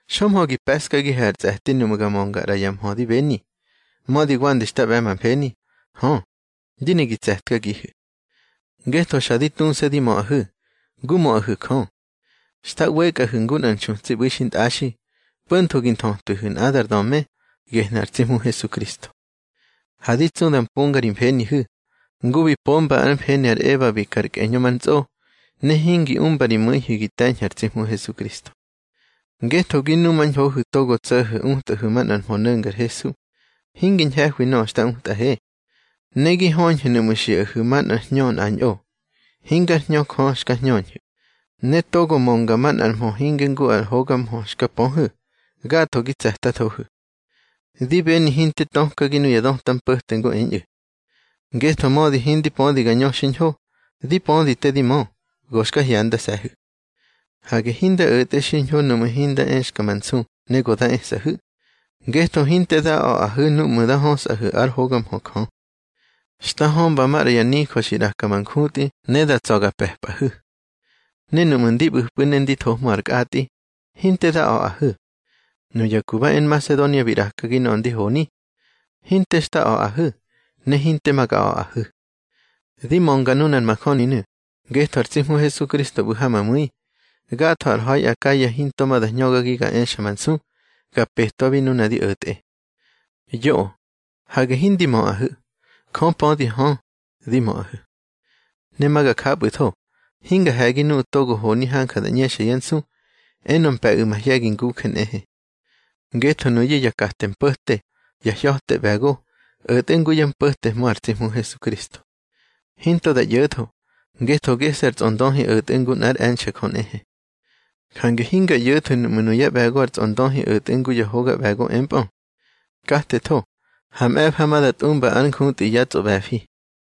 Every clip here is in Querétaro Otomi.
Xömhö gi pe̱ꞌskagihu̱ ar tsꞌe̱ti nuꞌmu̱ ga mönga ꞌra ya mhö di beni, mödi wande xta ꞌbe̱ ma mfeni. Hö, di ne gi tse̱tkagihu̱. Ngetho xa di tuse̱ di möꞌahu̱, ngu möꞌahu̱ Jö. Xta ꞌwekꞌahu̱ ngu nꞌar nxutsi ꞌbu̱i xintꞌaxi, po̱ntho gi nthötwihu̱ nꞌadar döme, gehnu̱ ar tsi Hmu Hesukristo. Ha di tsu da mponga ri mfenihu̱, ngu bi pomba ár mfeni ar Eba bi ka ar kꞌeñö ma ntsꞌo, ne hingi umba ri mu̱ihu̱ gi te̱ñhu̱ ar tsi Hmu Hesukristo. Ngetho gi numañhohu̱ togo tso̱ho̱ utꞌahu̱ manꞌar mhö no̱ngar Hesu, hingi ñhe̱hwi nöꞌö xta utꞌahe. Ne gi höñhu̱ nuꞌmu̱ xiꞌahu̱ manꞌar hñö nꞌañꞌo hingár Hñö Jö xka hñöñhu̱, ne togo mönga manꞌar mhö hinge ngu ar hoga mhö xka pöhu̱. Gatho gi tse̱tathohu̱. Di beni hinte tökagi nuya döta mpo̱te ngu eñꞌu̱. Ngetho mödi hindi pödi ga ñö xiñho, di pödi te di mö. Go xka hyandase̱hu̱. Hage hinda o̱tꞌe xiñho núꞌmu̱ hinda exka ma nsu ne go da esꞌahu̱, ngetho hinte da a̱ꞌahu̱ núꞌmu̱ nda hösꞌahe ár hoga mhö Jö. Xta hömba maꞌra ya nijö xi ꞌraka ma njutꞌi ne da tsa̱ ga pe̱pꞌahu̱. Ne núꞌmu̱ ndi ꞌbu̱pꞌu̱ ne ndi thohmö ar kꞌatꞌi, hinte da a̱ꞌahu̱. Nuya ku ba e Nmasedonia bi ꞌrakagi nöꞌö ndi honi. Hinte xta a̱ꞌahu̱, ne hinte ma ga a̱ꞌahu̱. Di mönga nunar majöninu̱, ngetho ar tsi Hmu Hesukristo ꞌbu̱ ha ma mu̱i. Gatho ar ha̱i Akaya hinto ma da hñögagi ga exa ma nsu ga petwabi nuna di o̱tꞌe. Yoꞌö. Hage hindi möꞌahu̱. Jö pödi hö, di möꞌahu̱. Ne ma ga japꞌu̱tho. Hinga he̱gi nuꞌu̱ togo honi hanja da ꞌñexa yá nsu, enö mpe̱ꞌu̱ mahye̱gi nguje nꞌehe. Ngetho nuyu̱ ya kate mpo̱te, ya hya̱te ꞌbe̱go, o̱tꞌe ngu yá mpo̱tehmö ar tsi Hmu Hesukristo. Hinto da ꞌyo̱tho, ngetho gese̱ ar tsꞌondöhi o̱tꞌe ngu nꞌár e̱nxe̱ Jö nꞌehe. Jange hinga ꞌyo̱thu̱ nuꞌmu̱ nuyá ꞌbe̱go ar tsꞌondöhi o̱tꞌe ngu ya hoga ꞌbe̱go empꞌö. Katetho, ha mꞌe̱fa ma da tꞌumba ár njutꞌi yá tsꞌoꞌbe̱fi.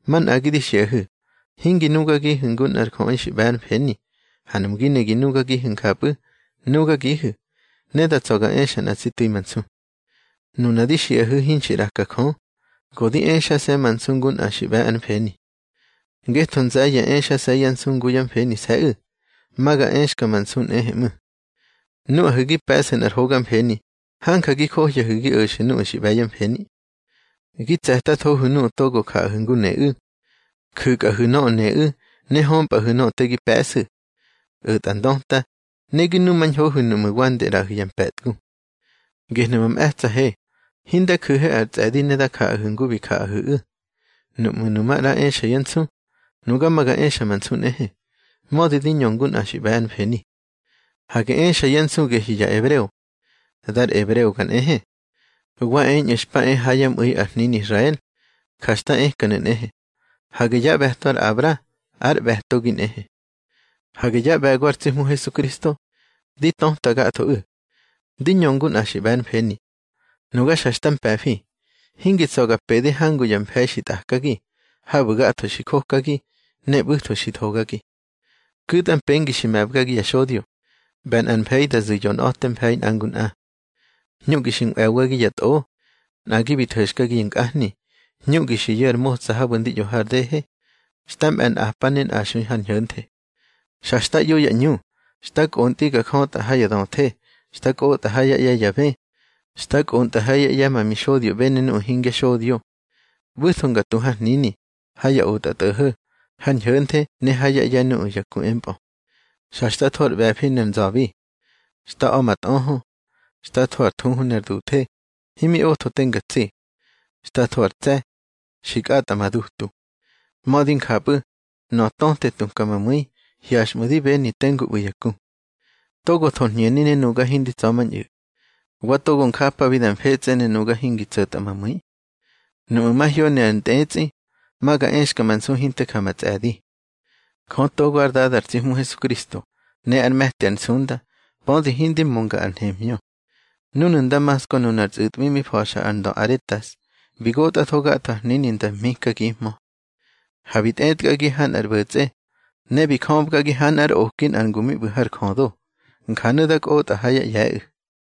Manꞌagi di xiꞌahu̱, hingi nugagihu̱ ngu nꞌar jöꞌi xi ꞌbe̱ ár mfeni. Ha nuꞌmu̱ gi ne gi nugagihu̱ njapꞌu̱, nugagihu̱, ne da tsa̱ ga exa nꞌa tsi tu̱i ma nsu. Nuna di xiꞌahu̱ hinxi ꞌraka Jö, go di exase̱ ma nsu ngu nꞌa xi ꞌbe̱ ár mfeni. Ngetho nze̱ye̱ exase̱ yá nsu ngu yá mfenise̱ꞌu̱, ma ga exka ma nsu nꞌehe ꞌmu̱. Nuꞌahu̱ gi pe̱ꞌsu̱ nꞌar hoga mfeni, hanja gi johyahu̱ gi o̱xu̱ nuꞌu̱ xi ꞌbe̱ yá mfeni. Gi tse̱tathohu̱ nuꞌu̱ togo jaꞌahu̱ ngu neꞌu̱. Ju̱kꞌahu̱ nöꞌö neꞌu̱, ne hömpꞌa̱hu̱ nöꞌö te gi pe̱ꞌsu̱. O̱tꞌa ndöta, ne gi numañhohu̱ nuꞌmu̱ wande ꞌraꞌahu̱ ya mpe̱tgu. Gehnu̱ ma mꞌe̱tsa̱he, hinda ju̱he ar tsꞌe̱di ne nga jaꞌahu̱ ngu bi jaꞌahu̱ꞌu̱. Nuꞌmu̱ nu maꞌra exa yá nsu, nuga ma ga exa ma nsu nꞌehe, mödi di ñö ngu nꞌa xi ꞌbe̱ ár mfeni. Hage exa yá nsu gehyu̱ ya ebreo. Dar ebreoga nꞌehe. Wa eñꞌu̱ xpa e ha yá mꞌu̱i ar hnini Israel. Ja xta ekanu̱ nꞌehe. Hage yá ꞌbe̱to ar Abra. Ár ꞌbe̱togi nꞌehe. Hage yá ꞌbe̱go ar tsi Hmu Hesukristo. Di töta gathoꞌu̱. Di ñö ngu nꞌa xi ꞌbe̱ ár mfeni. Nuga xa xta mpe̱fi. Hingi tsa̱ ga pede hangu ya mfe̱i xi tꞌakagi. Habu̱ gatho xi jokagi, ne ꞌbu̱tho xi thogagi. Ku̱tꞌa mpengi xi me̱bgagi ya xodyo, ꞌbe̱ nꞌar mfe̱i da zu̱ yonꞌa̱te mfe̱i nꞌa ngu nꞌa. Hñuꞌgi xi nꞌwe̱bgagi ya tꞌo. Nꞌagi bi tho̱xkagi ya nkꞌahni. Hñuꞌgi xi yu̱ ar motsa habu̱ ndi ꞌyo har dehe. Xta mꞌe̱ nꞌapa ne nꞌaxui har ñho̱nthe. Xa xta ꞌyo ya ꞌñu. Xta kꞌontꞌi nga jötꞌa ha ya döthe. Xta kꞌotꞌa ha yá ꞌye̱ ya bë. Xta kꞌontꞌa hayá ꞌye̱ ma mixodyoꞌbe ne nuꞌu̱ hingya xodyo. ꞌBu̱tho nga tu har hnini, ha ya otꞌatꞌo̱ho̱, har ñho̱nthe ne hayá ꞌye̱ nuꞌu̱ ya ku empꞌö. Xa xta tho ar ꞌbe̱fi ne ar nza̱bi. Xta a̱ ma tꞌöhö. Xta tho ar thuhu ner duthe, himi otho te nga tsi. Xta tho ar tse̱. Xi kꞌatꞌa ma dutu. Mödi njapꞌu̱, nöꞌö töte tuka ma mu̱i, hyaxꞌmu̱ di beni tengu ꞌbu̱ ya ku. Togo thor hñeni ne nuga hindi tsa̱mañꞌu̱. Wa togo njapabi da mfetsꞌe, ne nuga hingi tso̱tꞌa ma mu̱i. Nuꞌmu̱ mahyoni ar ntꞌetsꞌi, ma ga exka ma nsu hinte ja ma tsꞌe̱di. Jö togo ár Dada ar tsi Hmu Hesukristo, ne ár me̱ti ar nsunda, pödi hindi mönga ar nhemhñö. Núnu̱ Ndamasko nunar tsꞌu̱tꞌwi mi fa̱xa ar ndö Aretas, bi gotꞌatho gatho ar hnini nda mhikagihmö. Ha bi tꞌetkagi ha nꞌar ꞌbo̱tsꞌe, ne bi jöbgagi ha nꞌár oki nꞌar ngu mi ꞌbu̱ har jödo. Njanu̱ da kꞌotꞌa ha yá ꞌye̱ꞌu̱.